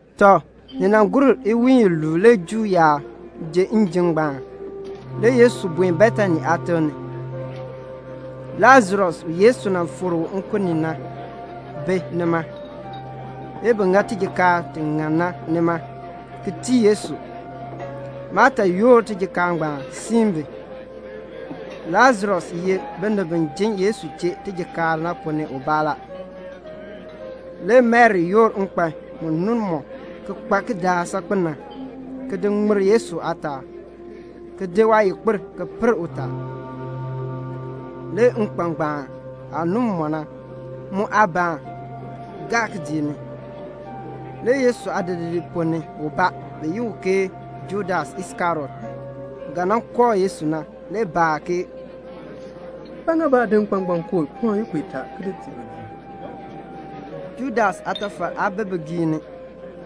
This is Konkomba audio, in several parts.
Tɔ, ni nan gur iwiin iluub le Juu yaab ji njim ngbaan, le Yesu buen Betani aatiŋ ni. Lasarus, u Yesu nan fikr u nkun ni na, bi nima. Le bi ŋa tijikaar ti ŋan na nima, ki tii Yesu. Mata yoor tijikaar ngbaan siin bi. Lasarus ye binib bi ji Yesu chee tijikaar na ponn ni ubaa la. Le Mari yoor nkpan mu nu mɔ ki kpa kidaak saakpen na, ki di ŋmir Yesu aataa, ki di waayikpir ki per utaa. Le nkpan ngbaan aah nu mɔ na, mu aabaan gaa kidiik ni. Le Yesu aadidiliib ponn ni ubaa, bi yi u ke Judas Iskariot, u ga nan kooh Yesu na, le baa ke, "Ba ŋa baa di nkpan ngbaan kooh pɔŋ ikub itaa ki di tii bigiim?" Judas aatafal aa bi bigiim ni.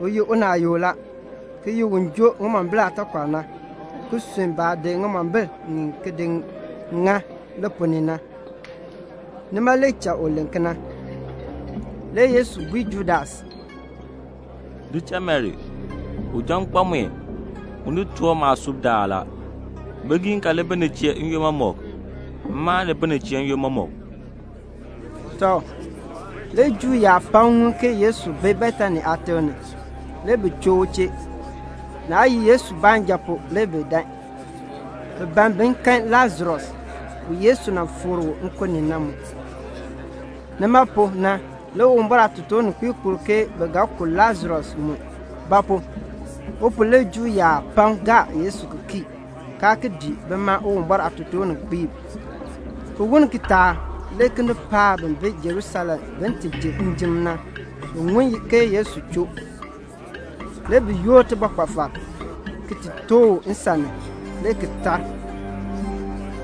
U ye unaayuk la, ki ye un joo ŋimombil aataakɔr na, ki sun baah di ŋimombil ŋi ki di ŋa li ponn ni na. Nima le cha u len kena. Le Yesu bui Judas, "Di cha Mari. U joo nkpan mue un toor maasub daal la. Bigiim ga li bi ni chee n-yoonn mɔmɔk. Mma aan li bi ni chee n-yoonn mɔmɔk." Tɔ, le Juu yaab pam ŋun ke Yesu bi Betani aatiŋ ni. Le bi choo u chee. Naa ye Yesu baanja pu le bi dan. Bi ban bi kan Lasarus, u Yesu nan fikr u nkun ni na mu. Nima pu na le Uwumbɔr aatotoorninkpiib kpokl ke bi ga ku Lasarus mu; ba pu? u pu le Juu yaab pam gaa Yesu ki kii, kaa ki dii bima Uwumbɔr aatotoorninkpiib. Ki woln kitaak le kinipaak bi bi Jerusalem bin ti ji njim na, bi ŋun ke Yesu choo. Le bi yoor tibɔkpaafar ki ti tooh u nsan ni, le ki tar,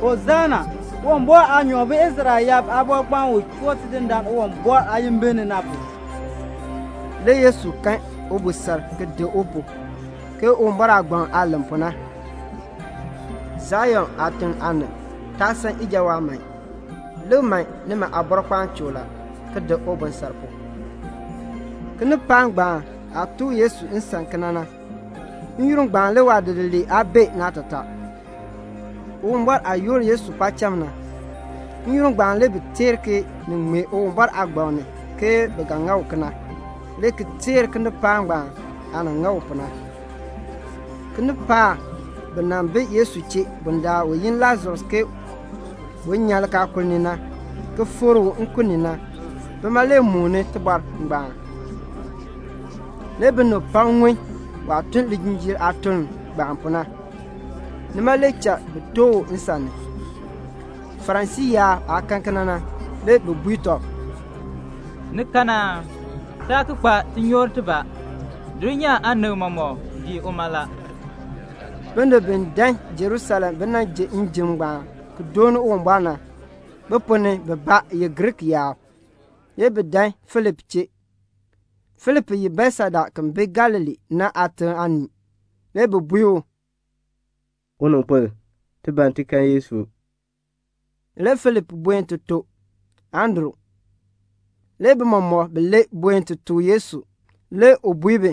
"Hosana, Uwumbɔr aanyoor bi Israel yaab Aabɔrkpaan u choo Tidindaan Uwumbɔr aayimbil ni na pu." Le Yesu kan ubonsar ki dik u pu, ke Uwumbɔr aagbaŋ aah len pu na: "Sion aatiŋ aanib, taa san ijawaan man. Lik man, nimi Aabɔrkpaan choo la, ki dik ubonsar pu." Kinipaak ngbaan aah tooh Yesu nsan kena na, n-yoonn ngbaan le waadidiliib aa bee naatataa. Uwumbɔr aah yoor Yesu paacham na, n-yoonn ngbaan le bi teer ke ni ŋmee Uwumbɔr aagbaŋ ni ke bi ga ŋa u kena, le ki teer kinipaak ngbaan aah nan ŋa u pu na. Kinipaak bi nan bi Yesu chee bundaln u yin Lasarus ke un nyan likaakul na ni, ki fikr u nkun ni na, bima le mooni tibɔr ngbaan. Le binib pam ŋun waah tun lijinjiir aatuln ngbaan pu na. Nima le cha bi tooh u nsan ni. Farisii yaab aah kan kena na, le bi bui tɔb, "Ni kan aa? Taa ki kpa tinyoor tibaa. Dulnyaa aanib mɔmɔk dii uma la." Binib bi dan Jerusalem bi nan ji njim ngbaan ki dooni Uwumbɔr na, bi ponn ni bibaa ye Griik yaab. Le bi dan Filip chee. Filip ye Betseda ki bi Galilee na aatiŋ aanii. Le bi bui u, "Uninkpil, ti ban ti kan Yesu." Le Filip buen ti tuk Andru. Le bi mɔmɔk bilee buen ti tuk Yesu. Le u bui bi,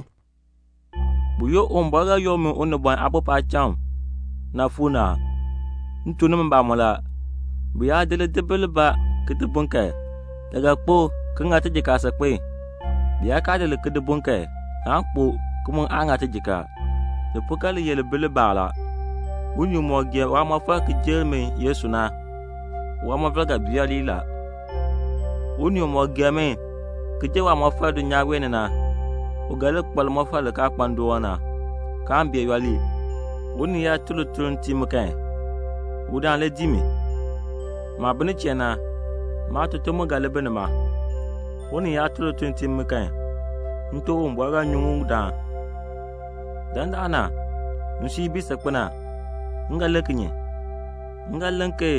"Buyoonn Uwumbɔr ga yoor min Unibɔn Aabo paacham na fuu ni a. M tuk nimi mbamɔn la, bi yaa di lidibil libaa ki di bun kan, li ga kpo ki ŋa tijikaar saakpen; bi yaa kaa di li ki bun kan, laan kpo, ki mu aan ŋa tijikaar. Li po ga li ye libil libaa la. Unii umɔk gee waamɔfal ki jer min Yesu na, waamɔfal ga bee yooli la. Unii umɔk gee min ki jer waamɔfal dulnyaa wee ni na, u ga li kpa limɔfal li kaa kpa ndoon na, kaan bee yooli. Unii yaa tun lituln tii mi kan, udaan li dii mi. Maah bi nin chee na, maatutuln mu ga li bi nima. Unii yaa tun lituln tii mi kan, Nte Uwumbɔr ga nyuŋ udaan." "Dandana, nsui bii saakpen a. M ga len kinye? M ga len ke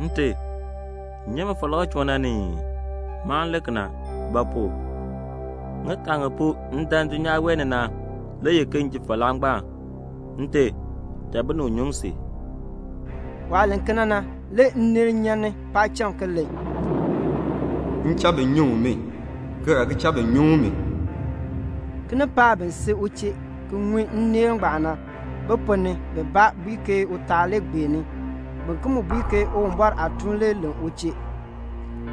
'Nte, nyan mi falaa u choo na ni ii?' Maan len kena; ba pu? ŋitaa ŋi pu m dan dulnyaa wee ni na le ye ke m ji falaa ngbaan. Nte, cha binib nyuŋ si." Waah len kena na, le nneel nyan ni paacham ki len, "M cha bi nyuŋ mi, ki ga ki cha bi nyuŋ mi." Kinipaak bi si u chee ki ŋun nneel ngbaan na, bi ponn ni bibaa bui ke utaal le gbenni, biken mu bui ke Uwumbɔr aatuun le len u chee.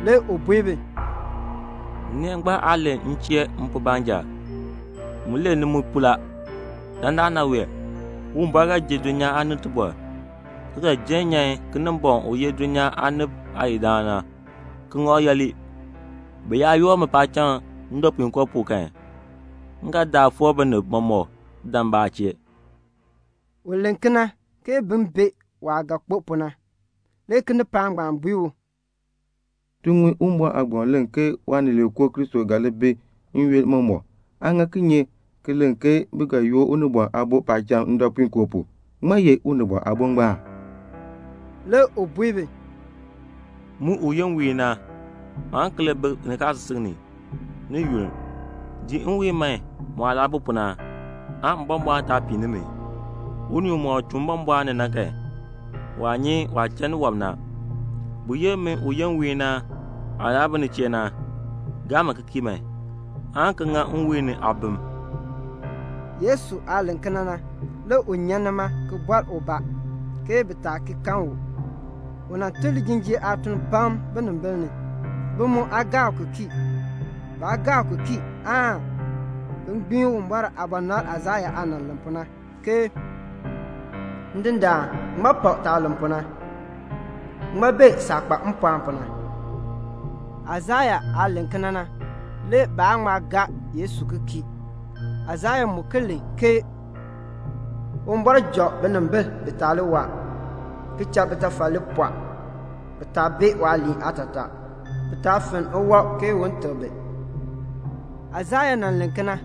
Le u bui bi, "Nneel ngbaan aa len m chee m pu baanja. Mu len ni mu pu la. Dandana wee, Uwumbɔr ga ji dulnyaa aanib tibɔr, ki ga jenn nyan Kinimbɔŋ u ye dulnyaa aanib aayidaan na, ki ŋa u yooli. Bi yaa yoor mi paacham ndɔpuinkoo pu kan, m ga daa foor binib mɔmɔk dan mbaa chee." U len kena, ke bin bee waah ga kpo pu na. Le kinipaak ngbaan bui u, "Ti ŋun Uwumbɔr aagbaŋ len ke Waanileekoo Kristo ga li bi n-yoonn mɔmɔk. Aa ŋa kinye ki len ke bi ga yoor Unibɔn Aabo paacham ndɔpuinkoo pu? Ŋmaa ye Unibɔn Aabo ngbaan?" Le u bui bi, "Min u ye nwiihn na, maan ki li bi nikaasisik ni, ni yunn. Dii nwiihn man mu aah laa bi pu na, aan mbɔmbɔɔn taa pii nimi. Unii umɔk chuun mbɔmbɔɔn ni na kan, waa nyi waah cha niwɔb na. Buyoonn min u ye nwiihn na, aah laa bi ni chee na, gaa mi ki kii man, aan ki ŋa nwiihn ni aabim." Yesu aah len kena na, le u nyan nima ki bɔr ubaa, ke bi taa ki kan u. U nan tun lijinjiir aatun pam binimbil ni. Bi mu aa gaa u ki kii. Baa gaa u ki kii, aan bi gbiin Uwumbɔr aabɔnabr Aisaya aah nan len pu na, ke "Ndindaan, ŋmaa pak taah len pu na? Ŋmaa bee saah kpa mpɔɔn pu na?" Aisaya aah len kena na, le baa ŋma gaa Yesu ki kii; Aisaya mu ki len ke "Uwumbɔr job binimbil, bi taa li waa; ki cha bitafal li pɔɔ, bi taa bee waaliin aatataa, bi taa fenn uwɔb ke un teb bi." Aisaya nan len kena;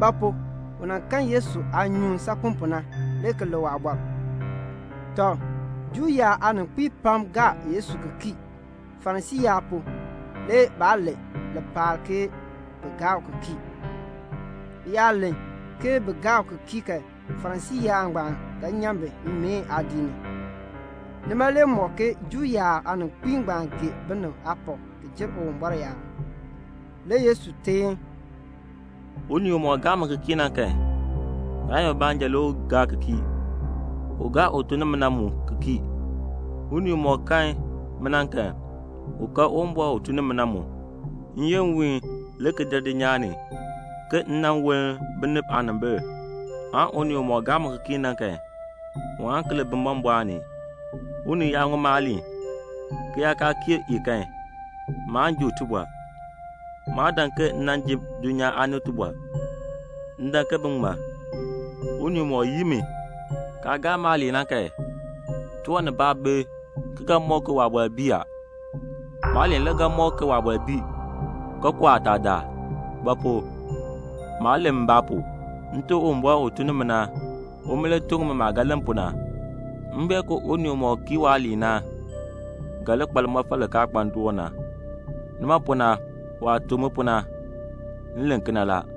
ba pu? u nan kan Yesu aah nyuun saakpen pu na, le ki len waabɔr. Tɔ, Juu yaab aaninkpiib pam gaa Yesu ki kii; Farisii yaab pu, le baa len lipaal ke bi gaa u ki kii. Bi yaa len ke bi gaa u ki kii kan, Farisii yaab ngbaan ga nyan bi mmeen aadiik ni. Nima le mɔk ke Juu yaab aaninkpiib ngbaan gee binib aapak ki jer Uwumbɔr yaan. Le Yesu teen, "Unii umɔk gaa mi ki kii na kan, naa ye min baanja le u gaa ki kii, u gaa un tun ni mi na mu ki kii. Unii umɔk kan mi na kan, u kan Uwumbɔr u tun ni mi na mu. M ye nwiihn le ki dan dulnyaa ni, ke m nan woln binib aanimbil, aan unii umɔk gaa mi ki kii na kan, waan ki li bi mbɔmbɔɔn ni. Unii yaa ŋun maaliin, ki yaa kaa kii i kan, maan ji u tibɔr; maa dan ke m nan ji dulnyaa aanib tibɔr, m dan ke bin ŋmar. Unii umɔk yii mi, kaa gaa maaliin na kan, tiwan nibaa bi ki ga mɔk ke waabɔr bii a. Maaliin le ga mɔk ke waabɔr bii, kookoo aataadaal; ba pu? maa len mbaa pu. Nte Uwumbɔr u tun ni mi na, uma le tuk mi maah ga len pu na. M bee ke unii umɔk kii waaliin na, ga li kpa limɔfal li kaa kpa ndoon na. Nima pu na waah tuk mi pu na, m len kena la."